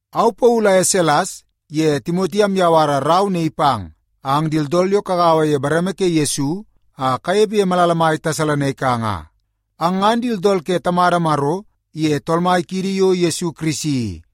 Au Paulu aye Selas ye Timoti amyawara rau naii pang ang di tooltool yo kagaua ye bareme ke Yesu a kayepe ye malala mai Tesalonaika nga. Ang ngan di tooltool ke Tamada Maro iye Tool Mai kiidi yo Yesu Kirisi i.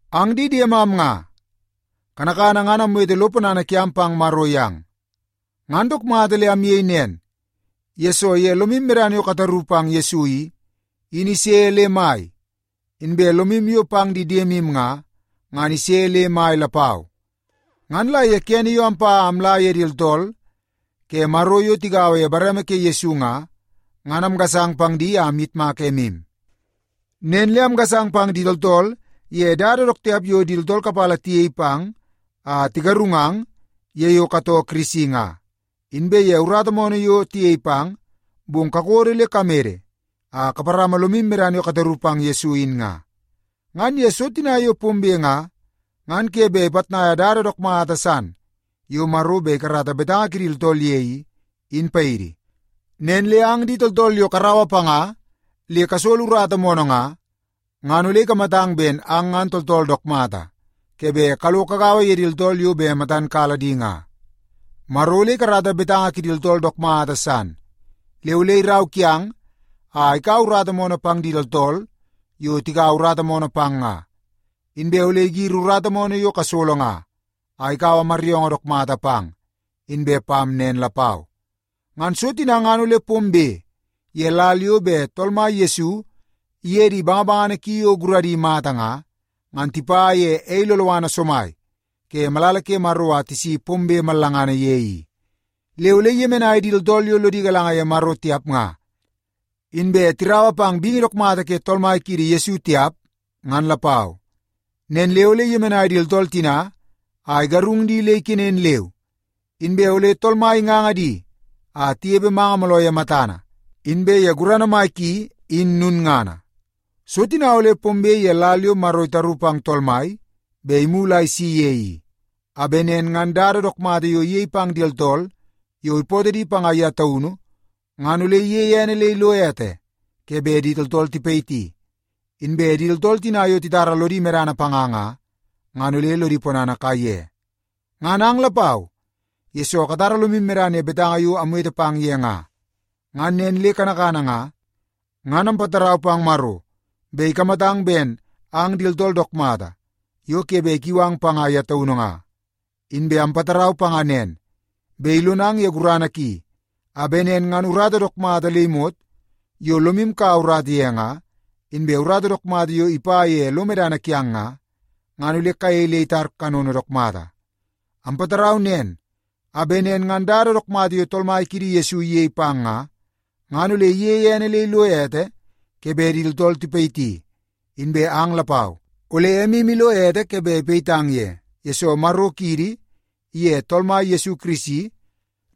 Ang di diemam nga, kanakana ngan amwete lo ponana kiam pang Maro yang. Ngan dook mata le amyei nen, yesoo ye lomim medana yo kataru pang Yesu i, in ise le mai, inbe lomim yo pang di diemim nga, ngan ise le mai lapau. Ngan la ye kene yo ampa a amla ye di tooltool ke Maro yo tigaua ye bareme ke Yesu nga, ngan amgasang pang di a amyitmak emim. Nen le amgasang pang di tooltool ye dada dook tiap yo di tooltool kapala tiyei pang a tigarungang ye yo katoo Kirisi nga, inbe ye urata moonoo yo tiyei pang, bong kakodo le kamede a kaparama lomim medana yo kataru pang Yesu in nga. Ngan ye so tina yo pombe nga, ngan ke be ipatnaia dada dook mata san yo Maro be ikarata betanga kidi tooltool ye i, in paidi. Nen le ang di tooltool yo karaua panga le kasolo urata moonoo nga, ngan ole ikamatang ben ang ngan tooltool dook mata ke be kalo kagaua ye di tooltool yo be matan kala di nga. Maro ole ikarata betanga kidi tooltool dook mata san. Le ole irau kiang a ikaua urata moonoo pang di tooltool yo tikaua urata moonoo pang nga. Inbe ole igiri urata moonoo yo kasolo nga, a ikaua maryoongoo dook mata pang inbe pam nen lapau. Ngan so tina ngan ole pombe ye lal yo be Tool Mai Yesu iye di bangabangana ki yo guradi mata nga, ngan tipa ye ei loloana somai ke malala ke Maro a tisi pombe mallangana ye i. Le ole iyemenai di tooltool yo lodi galanga ye Maro tiap nga, inbe tiraua pang bingi dook mata ke Tool Mai kiidi Yesu tiap ngan lapau. Nen le ole iyemenai di tooltool tina a igarung di le ikenen leu, inbe ole Tool Mai inganga di a tiyepe manga mooloo ye matana inbe ye gurana mai ki in nunngana. So tina ole pombe ye lal yo Maro itaru pang Tool Mai be imulu a isi ye i, a be nen ngan dada dook mata yo iyei pang di tooltool yo ipootoo di panga ya taunu ngan ole iyeie ene le ilo ete ke be di tooltool tipayiti, inbe di tooltool tina yo titara lodi medana panga nga, ngan ole lodi ponana kaiye. Ngan ang lapau, yesoo katara lomim medana ye betanga yo amwete pang ye nga. Ngan nen le kanakana nga, ngan ampatarau pang Maro be ikamatang ben ang di tooltool dook mata yo ke be ikiu di panga ya taunu nga. Inbe ampatarau panga nen, be ilonang ye gurana ki a be nen ngan urata dook mata le imot yo lomim kaua urata ye nga, inbe urata dook mata yo ipa ye lo medana kiang nga, ngan ole kayei le itar kanono dook mata. Ampatarau nen a be nen ngan dada dook mata yo Tool Mai kiidi Yesu iyei pang nga, ngan ole iyeie ene le ilo ete ke be di tooltool tipayiti. Inbe ang lapau, ole emim ilo ete ke be ipayitang ye, yesoo Maro kiidi iye Tool Mai Yesu Kirisi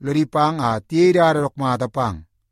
lodi pang a tiyei dada dook mata pang.